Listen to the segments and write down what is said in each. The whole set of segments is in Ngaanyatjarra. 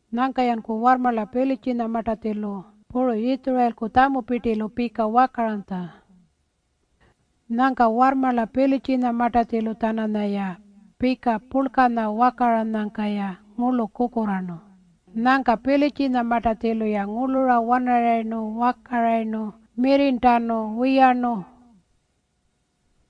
Nyangka-yanku warrmarla Pilitjinyamartatjilu puru Yitjurayilku tjamupirtilu pika wakaranytja. Nyangka warrmarla Pilitjinyamartatjilu-tjananyaya pika purlkanya wakaranyangka-ya ngurlu kukurraarnu. Nyangka Pilitjinyamartatjilu-ya ngurlura wanarayirnu wakarayirnu mirrirntanu wiyarnu.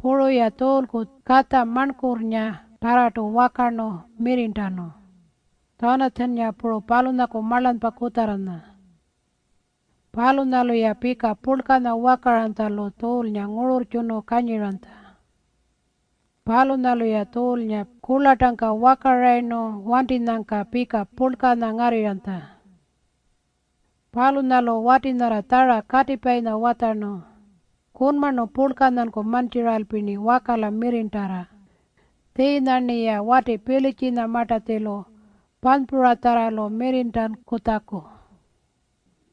Puru-ya Tjuulku katja marnkurrngatarrartu wakarnu mirrirntanu, Tjanatjannga puru palunyaku marlanypa kutjarra. Palunyalu-ya pika purlkanya wakaranytjalu Tjuulnga ngururrtjunu kanyiranytja. Palunyalu-ya Tjuulnga kurlartangka wakarayirnu wantinyangka pika purlkanya ngarrirranytja. Palunyalu wati nyarra tjara katipayinya watjarnu, “Kunmarnu purlkanyanku mantjiralpi-rni wakala mirrirntarra tjiinya-rniya wati Pilitjinyamartatjilu panypuratjarralu mirrirntankutjaku.”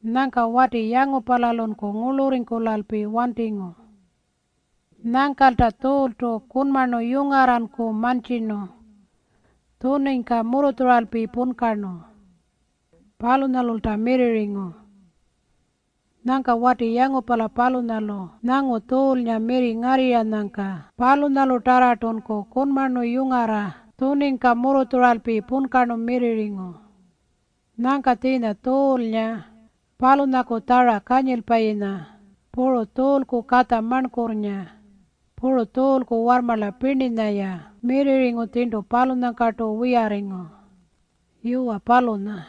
Nyangka wati yangupalalunku ngurlurringkulalpi wantingu. Nyangkalta Tjuultu kunmarnu yungarranku mantjirnu tjuningka murrutjuralpi punkarnu. Palunyalulta mirrirringu. Nyangka wati yangupala palunyalu nyangu Tjuulnga mirri ngarrirranyangka palunyalutarrartunku kunmarnu yungarra tjuningka murrutjuralpi punkarnu mirrirringu. Nyangka tjiinya Tjuulnga, palunyaku tjara kanyilpayinya, puru Tjuulku katja marnkurrnga, puru Tjuulku warrmarla pirninya-ya mirrirringu tjirntu palunyangkartu wiyarringu. Yuwa, palunya.